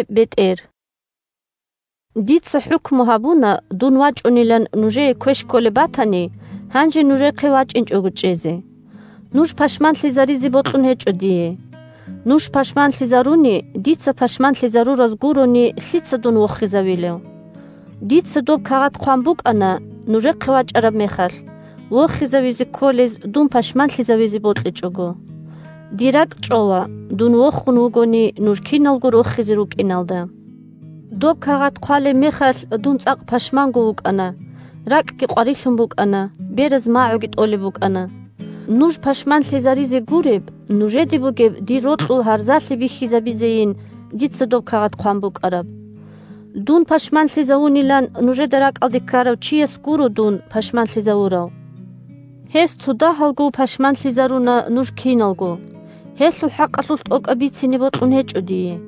бетӀер 1Дица хӀукму гьабуна, дун вачӀунилан нужее квеш кколеб батани, гьанже нужехъе вачӀинчӀого чӀезе. Нуж пашманлъизаризе бокьун гьечӀо дие. 2Нуж пашманлъизаруни, дица пашманлъизарураз гурони, лъица дун вохизавилев? Дица доб кагъат хъван букӀана нужехъе вачӀараб мехалъ, вохизавизе кколез дун пашманлъизавизе бокьичӀого. Дир ракӀчӀола, дун вохун вугони, нуж киналго рохизе рукӀиналда. Доб кагъат хъвалеб мехалъ дун цӀакъ пашманго вукӀана: ракӀги къварилъун букӀана, бераз магӀуги тӀолеб букӀана. Нуж пашманлъизаризе гуреб, нужеде бугеб дир рокьул гьарзалъи бихьизабизейин дица доб кагъат хъван букӀараб. Дун пашманлъизавунилан нужеда ракӀалде ккарав чияс дун гуро пашманлъизавурав. Гьес цодагьалго пашманлъизаруна нуж киналго, гьелъул хӀакъалъулъ тӀокӀаб бицине бокьун гьечӀо дие.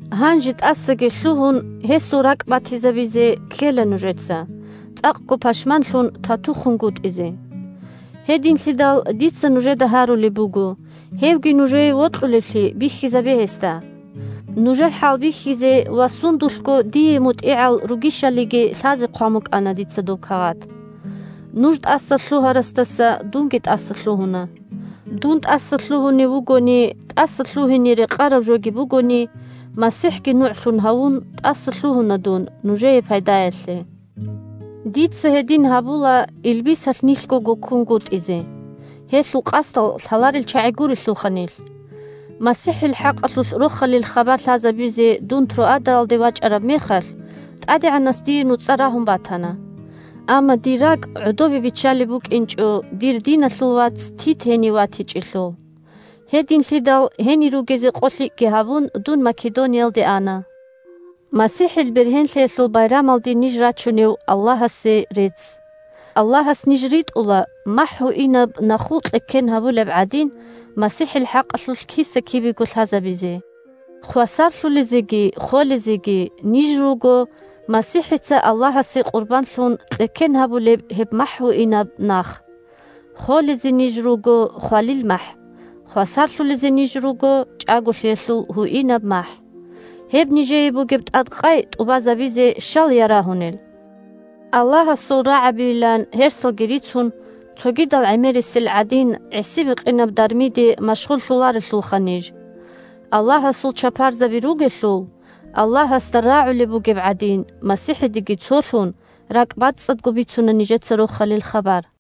Гьанже, тӀасаги лъугьун, гьесул ракӀбатизабизе ккела нужеца, – цӀакъго пашманлъун, тату хунгутӀизе. Гьединлъидал дица нужеда гьарулеб буго: гьевги нужее вокьулевлъи бихьизабе гьесда. Нужер хӀалбихьизе ва сундулъго дие мутӀигӀал ругищалиги лъазе хъван букӀана дица доб кагъат. Нуж тӀасалъугьарасдаса дунги тӀасалъугьуна. Дун тӀасалъугьунев вугони (тӀасалъугьине рекъараб жоги бугони), МасихӀги нугӀлъун гьавун, тӀасалъугьуна дун – нужее пайдаялъе. Дица гьедин гьабула, илбисалъ нилъго гуккунгутӀизе, – гьелъул къасдал лъаларел чагӀи гурелъулха нилъ. МасихӀил хӀакъалъулъ Рохалил хабар лъазабизе дун Троадаялде вачӀараб мехалъ, ТӀадегӀанас дие нуцӀа рагьун батана. Амма дир ракӀ гӀодобе биччалеб букӀинчӀо дир диналъул вац Тит гьенив ватичӀелъул. Гьединлъидал, гьенир ругезе къолъикӀги гьабун, дун Македониялде ана. МасихӀил бергьенлъиялъул байрамалде ниж рачунев Аллагьасе рецц! Аллагьас ниж ритӀула, махӀ гьуинаб нахул кьеккен гьабулеб гӀадин, МасихӀил хӀакъалъулъ киса-кибего лъазабизе. Хвасарлъулезеги холезеги ниж руго – МасихӀица Аллагьасе къурбанлъун кьеккен гьабулеб гьеб махӀ гьуинаб нах. Холезе ниж руго – хвалил махӀ, хвасарлъулезе ниж руго – чӀаголъиялъул гьуинаб махӀ. Гьеб нижее бугеб тӀадкъай тӀубазабизе щал ярагьунел? Аллагьасул рагӀабийилан гьерсалги рицун, цогидал гӀемерисел гӀадин гӀиси-бикъинаб дармиде машгъуллъуларелъулха ниж! Аллагьасул чапарзаби ругелъул, Аллагьасда рагӀулеб бугеб гӀадин, МасихӀидеги цолъун, ракӀбацӀцӀадго бицуна нижеца Рохалил хабар.